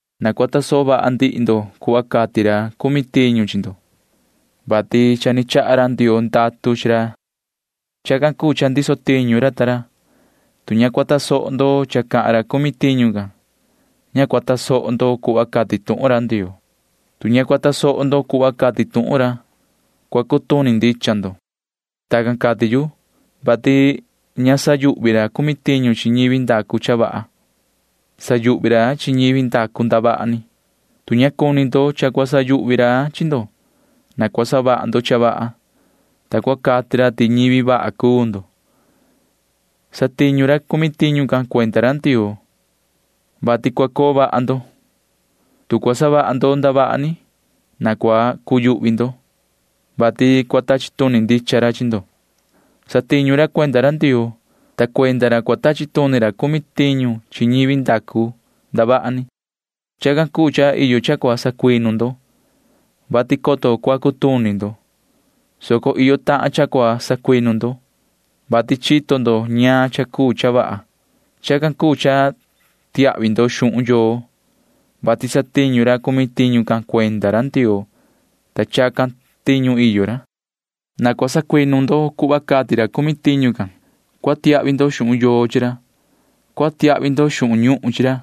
Na cua tasoho vaha ndihi ndo cuhva cati ra cumi tiñu chi ndo, vati cha ni chaha ra Ndioo ndatu chi ra. Chacan cuu cha ndiso ra ta ra tiñu. Tu ña cua tasoho ndo cha cati ra cumi tiñu can, ña cua tasoho ndo cuhva cati tuhun ra Ndioo. Tu ña cua tasoho ndo cuhva cati tuhun ra, cua cutuni ndicha ndo. Tacan cati yu, vati ña sayuhvi ra cumi tiñu chi ñivi ndacu cha vaha. Sayuhvi ra chi ñivi ndacu ndavaha ni. Tu cua cuni ndo cha ña cua sayuhvi ra chi ndo, na cua savaha ndo cha vaha, ta cua cati ra ti ñivi vaha cuu ndo. Satiñu ra cumi tiñu can cuenda ra Ndioo, vati cua coo vaha ndo. Tu cua savaha ndo ndavaha ni, na cua cuyuhvi ndo, vati cua tachi tuni ndicha ra chi ndo. Satiñu ra cuenda ra Ndioo, ta cuenda ra cua tachi tuni ra cumi tiñu chi ñivi ndacu ndavaha ni. Chacan cuu cha iyo cha cua sacuinu ndo, vati coto cua cutuni ndo, soco iyo tahan cha cua sacuinu ndo, vati chito ndo ñaan cha cuu cha vaha. Chacan cuu cha tiahvi ndo xuhun yoo, vati satiñu ra cumi tiñu can cuenda ra Ndioo, ta chacan tiñu iyo ra. Na cua sacuinu ndo cuhva cati ra cumi tiñu can. Cua tiahvi ndo xuhun yoo chi ra. Cua tiahvi ndo xuhun ñuhun chi ra,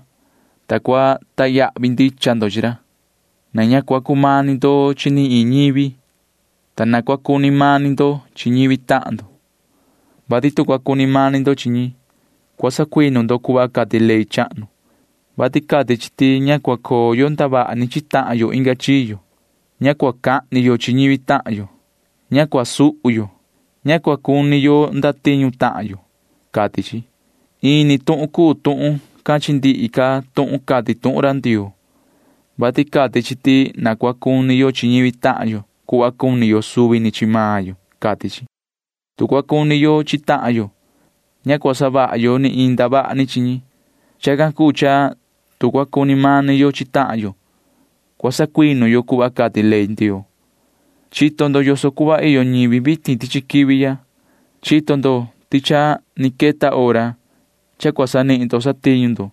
ta cua sacahnu ndicha ndo chi ra. Na ña cua cumani ndo chi ni iin ñivi, ta na cua cuni mani ndo chi ñivi tahan ndo, vati tu cua cuni mani ndo chi ñi, cua sacuinu ndo cuhva cati ley chahnu, vati cati chi ti ña cua coo yo ndavaha ni chi tahan yo inga chiyo. Ña cua cahni yo chi ñivi tahan yo. Ña cua suhu yo. Ña cua cuni xaan yo chachi tahan yo, cati chi. Ini tuhun cuu tuhun can chi ndihi ca tuhun cati tuhun ra Ndioo, vati cati chi ti na cua cuni yo chi ñivi tahan yo cuhva cuni yo suvi ni chi maan yo, cati chi. Tu cua cuni yo chi tahan yo, ña cua savaha yo ni iin ndavaha ni chi ñi. Chacan cuu cha tu cua cuni mani yo chi tahan yo, cua sacuinu yo cuhva cati ley Ndioo can. Chito ndo yoso cuhva iyo ñivi vitin tichi quivi ya. Chito ndo ti cha ni queta hora cha cua sanihin ndo satiñu ndo,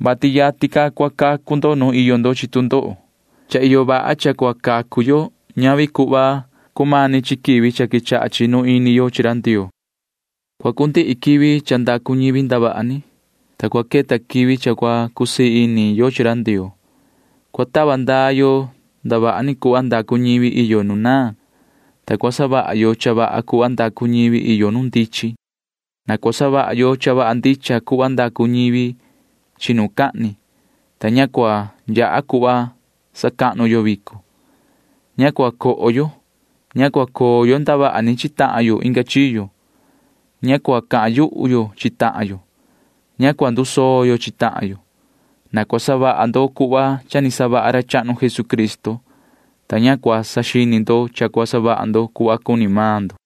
vati yatin ca cua cacu ndo nu iyo ndo chi tu ndoho. Ña cumani ca cha cua cacu yo cuhva ni cumani chi quivi ni quechaha chinu ini yo chi ra Ndioo. Cua cundihi quivi nu ndacu ñivi ndavaha ni, ta cua queta quivi nu cua cusii ini yo chi ra Ndioo. Cua tava ndaa yo ndavaha ni cuhva ndacu ñivi nu naan, ta cua savaha yo cha vaha cuhva ndacu ñivi nu ndichin. Na cua savaha yo cha vaha ndicha cuhva ndacu ñi chinucahni, ta ña cua yaha cuhva sacahnu yo vico. Ña cua coho yo. Ña cua coo yo ndavaha ni chi tahan yo inga chiyo. Ña cua cahan yuhu yo chi tahan yo. Ña cua ndusoo yo chi tahan yo. Na cua savaha ndo cuhva cha ni savaha ra chahnu Jesucristo, ta na ña cua saxini ndo yoso cuhva cua savaha ndo cuhva cuni maan ndo.